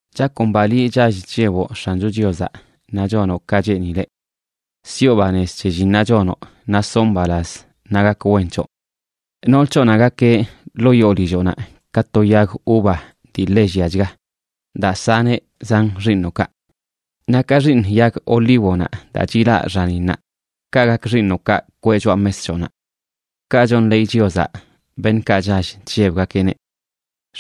Chakomba liꞌ, chall chlleboꞌ X̱ancho Chiozaꞌ naꞌ chonoꞌ ka cheenileꞌ. Siꞌo banez c̱he llinnaꞌ chonoꞌ, naꞌ soꞌ mbalaz naꞌ gak wen c̱hoꞌ. Nool c̱hoꞌnaꞌ gakeꞌ ḻoo yoo lilloꞌnaꞌ ka to yag uva dii ḻe lliachga daa saneꞌ zan xiiṉoꞌkaꞌ. Naꞌ ka xiiṉ yag olívonaꞌ daa chilaꞌ xaninnaꞌ, kaꞌ gak xiiṉoꞌkaꞌ kweꞌ choꞌa mes c̱hoꞌnaꞌ. Kaꞌ chonḻeey Chiozaꞌ beṉꞌkaꞌ chall chllebgakeꞌneꞌ.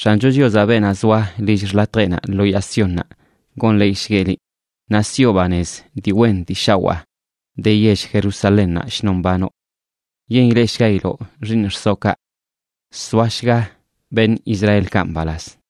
X̱ancho Chiozaꞌ, beenaꞌ zoa lill xḻatjeꞌnaꞌ lo yaa Siónnaꞌ, gonḻeeyshgueꞌ liꞌ, naꞌ siꞌo banez dii wen dii shawaa de yell Jerusalénnaꞌ shnon mbanoꞌ. Yen ileꞌshgailoꞌ xiiṉ xsoꞌkaꞌ. Soashga beṉꞌ Israelkaꞌ mbalaz.